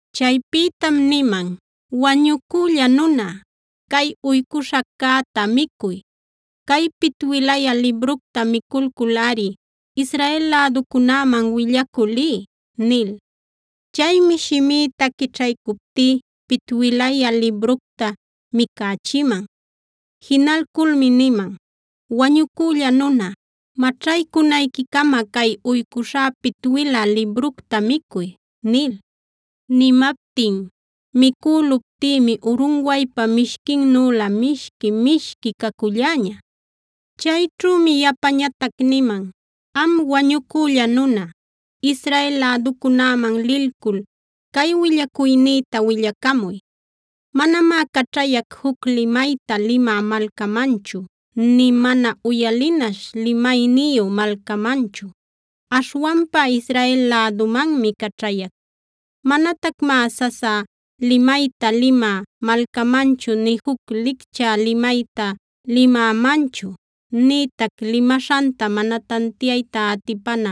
Chaypïtam niman: “Wañucülla nuna, cay uycuśhaccäta micuy; cay pitwilayä libructa miculculꞌari Israel läducunäman willacü liy” nil. Chaymi shimïta quićhaycuptí pitwilayä libructa micächiman. Jinalculmi niman: “Wañucülla nuna, maćhaycunayquicama cay uycuśhá pitwilä libructa micuy” nil.a Nimaptin micüluptïmi urunwaypa mishquinnülä mishqui-mishqui caculläña. Chayćhümi yapañatac niman: “Am wañucülla nuna, Israel läducunäman lilcul cay willacuynïta willacamuy. Manamá caćhayac juc limayta limä malcamanchu nï mana uyalinaśh limayniyu malcamanchu. Aśhwanpa Israel lädumanmi caćhayac. Manatacmá sasa limayta limä malcamanchu nï juc lichcä limayta limämanchu, nïtac limaśhanta mana tantiayta atipana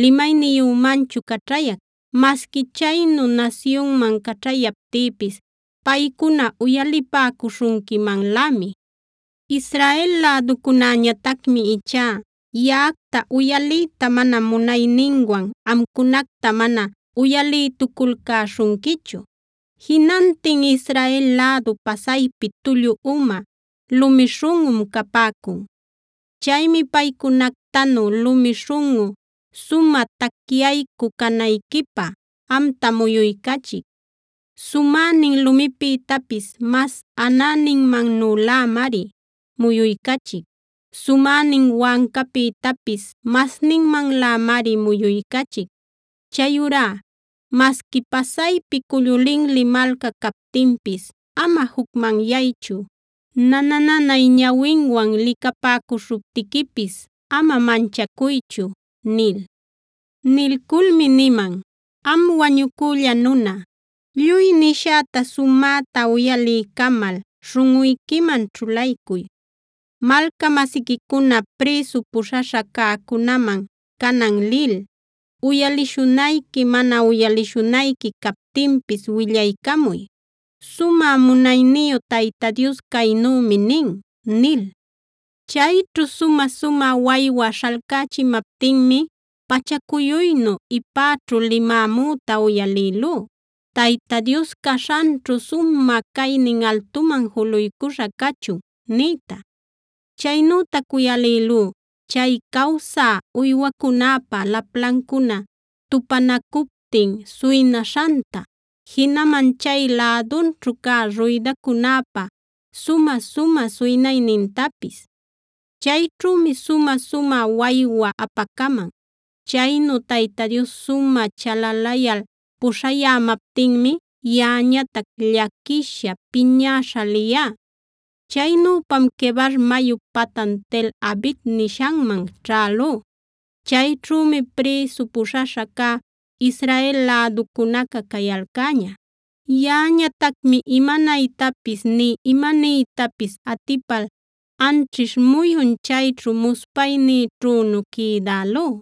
limayniyümanchu caćhayac. Masqui chaynu nasyunman caćhayaptïpis paycuna uyalipäcuśhunquimanlämi. Israel läducunäñatacmi ichá yaꞌacta uyaliyta mana munayninwan amcunacta mana uyalïtuculcäśhunquichu. Jinantin Israel lädu pasaypi tullu uma, lumi śhunꞌum capäcun. Chaymi paycunactanu lumi śhunꞌu, sumä tacyaycü canayquipä amta muyuycachic. Sumänin lumipïtapis mas anäninmannülämari muyuycachic; sumänin wancapïtapis masninmanlämari muyuycachic. Chayurá masqui pasaypi cullu linli malca captinpis ama jucmanyaychu, nana-nanay ñawinwan licapäcuśhuptiquipis ama manchacuychu” nil. Nilculmi niman: “Am wañucülla nuna, lluy nishäta sumäta uyaliycamal śhunꞌuyquiman ćhulaycuy. Malca-masiquicuna prïsu puśhaśha cäcunäman canan lil, uyalishunayqui mana uyalishunayqui captinpis willaycamuy: ‘Sumä munayniyu Tayta Dios caynümi nin’” nil. Chayćhu sumä-sumä waywa śhalcächimaptinmi pachacuyuynu ipäćhu limämüta uyalïlú: “¡Tayta Dios caśhanćhu sumä caynin altuman juluycuśha cachun!” niyta. Chaynütac uyalïlú chay cawsä uywacunäpa laplancuna tupanacuptin suynaśhanta, jinaman chay lädunćhu cä ruydacunäpa sumä-sumä suynaynintapis. Chayćhümi sumä-sumä waywa apacaman. Chaynu Tayta Dios sumä chalalayal puśhayämaptinmi yaꞌañatac llaquisha, piñäśha liyá. Chaynüpam Quebar mayup patan Tel-abib nishanman ćhälú. Chayćhümi prïsu puśhaśha cä Israel läducunaca cayalcäña. Yaꞌañatacmi imanaytapis nï imaniytapis atipal anćhish muyun chayćhu muspaynïćhünu quïdälú.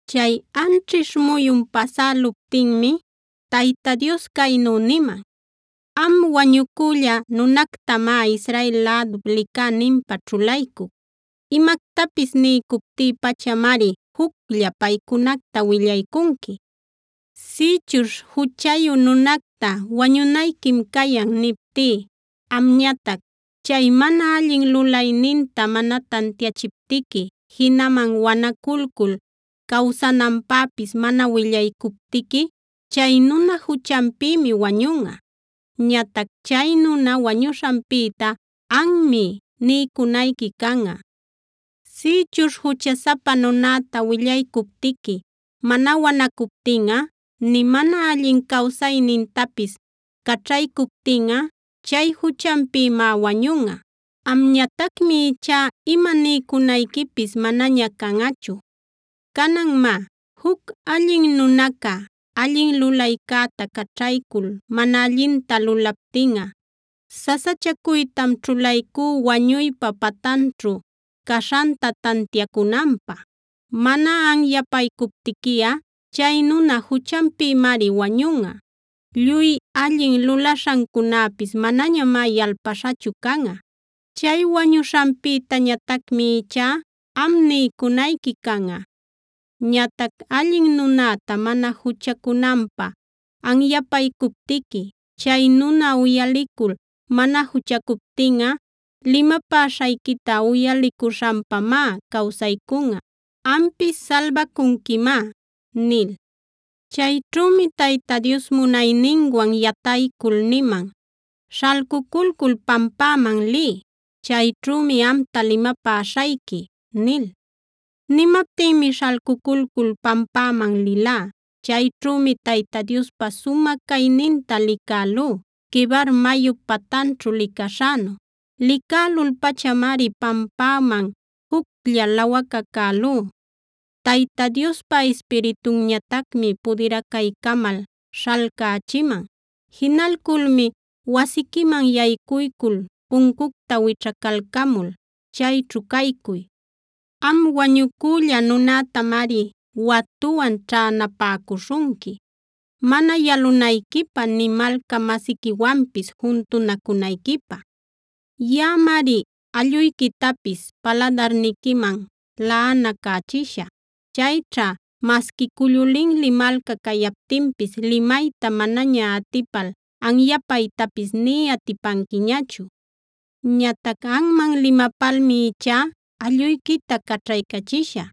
Chay anćhish muyun pasäluptinmi Tayta Dios caynu niman: “Am wañucülla nunactamá Israel lädup licäninpä ćhulaycuc.b Imactapis niycuptí pachamari juclla paycunacta willaycunqui. Sïchuśh juchayu nunacta: ‘Wañunayquim cayan’ niptí, amñatac chay mana allin lulayninta mana tantiachiptiqui, jinaman wanaculcul cawsananpäpis mana willaycuptiqui, chay nuna juchanpïmi wañunꞌa. Ñatac chay nuna wañushanpïta anmi niycunayqui canꞌa. Sïchuśh juchasapa nunäta willaycuptiqui mana wanacuptinꞌa, nï mana allin cawsaynintapis caćhaycuptinꞌa chay juchanpïmá wañunꞌa. Amñatacmi ichá ima niycunayquipis manaña canꞌachu. Canan má, juc allin nunaca, allin lulaycäta caćhaycul mana allinta lulaptinꞌa sasachacuytam ćhulaycú wañuypa patanćhu caśhanta tantiacunanpä. Mana anyapaycuptiquiꞌa chay nuna juchanpïmari wañunꞌa. Lluy allin lulaśhancunäpis manañamá yalpalcuśhachu canꞌa. Chay wañuśhanpïtañatacmi ichá am niycunayqui canꞌa. Ñatac allin nunäta mana juchacunanpä anyapaycuptiqui, chay nuna uyalicul mana juchacuptinꞌa, limapäśhayquita uyalicuśhanpamá cawsaycunꞌa. Ampis salbacunquimá” nil. Chayćhümi Tayta Dios munayninwan yataycul niman: “Śhalcuculcul pampäman liy. Chayćhümi amta limapäśhayqui” nil. Nimaptinmi śhalcuculcul pampäman lilá. Chayćhümi Tayta Diospa sumä cayninta licälú Quebar mayup patanćhu licaśhänu. Licälul-pachamari pampäman juclla lawacacälú. Tayta Diospa Ispiritunñatacmi pudiracaycamal śhalcächiman. Jinalculmi: “Wasiquiman yaycuycul puncucta wićhacalcamul chayćhu caycuy. Am wañucülla nunätamari watuwan ćhänapäcuśhunqui, mana yalunayquipä nï malca-masiquiwanpis juntunacunayquipä. Yaꞌamari alluyquitapis paladarniquiman laꞌanacächishä. Chayćha masqui cullu linli malca cayaptinpis limayta manaña atipal anyapaytapis nï atipanquiñachu. Ñatac anman limapalmi ichá alluyquita caćhaycachishä.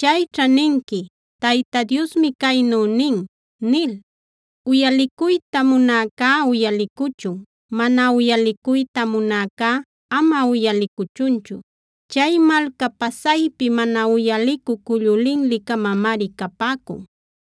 Chayćha ninqui: ‘Tayta Diosmi caynu nin’ nil. Uyalicuyta munäcá uyalicuchun; mana uyalicuyta munäcá ama uyalicuchunchu. Chay malca pasaypi mana uyalicü cullu linli-camamari capäcun.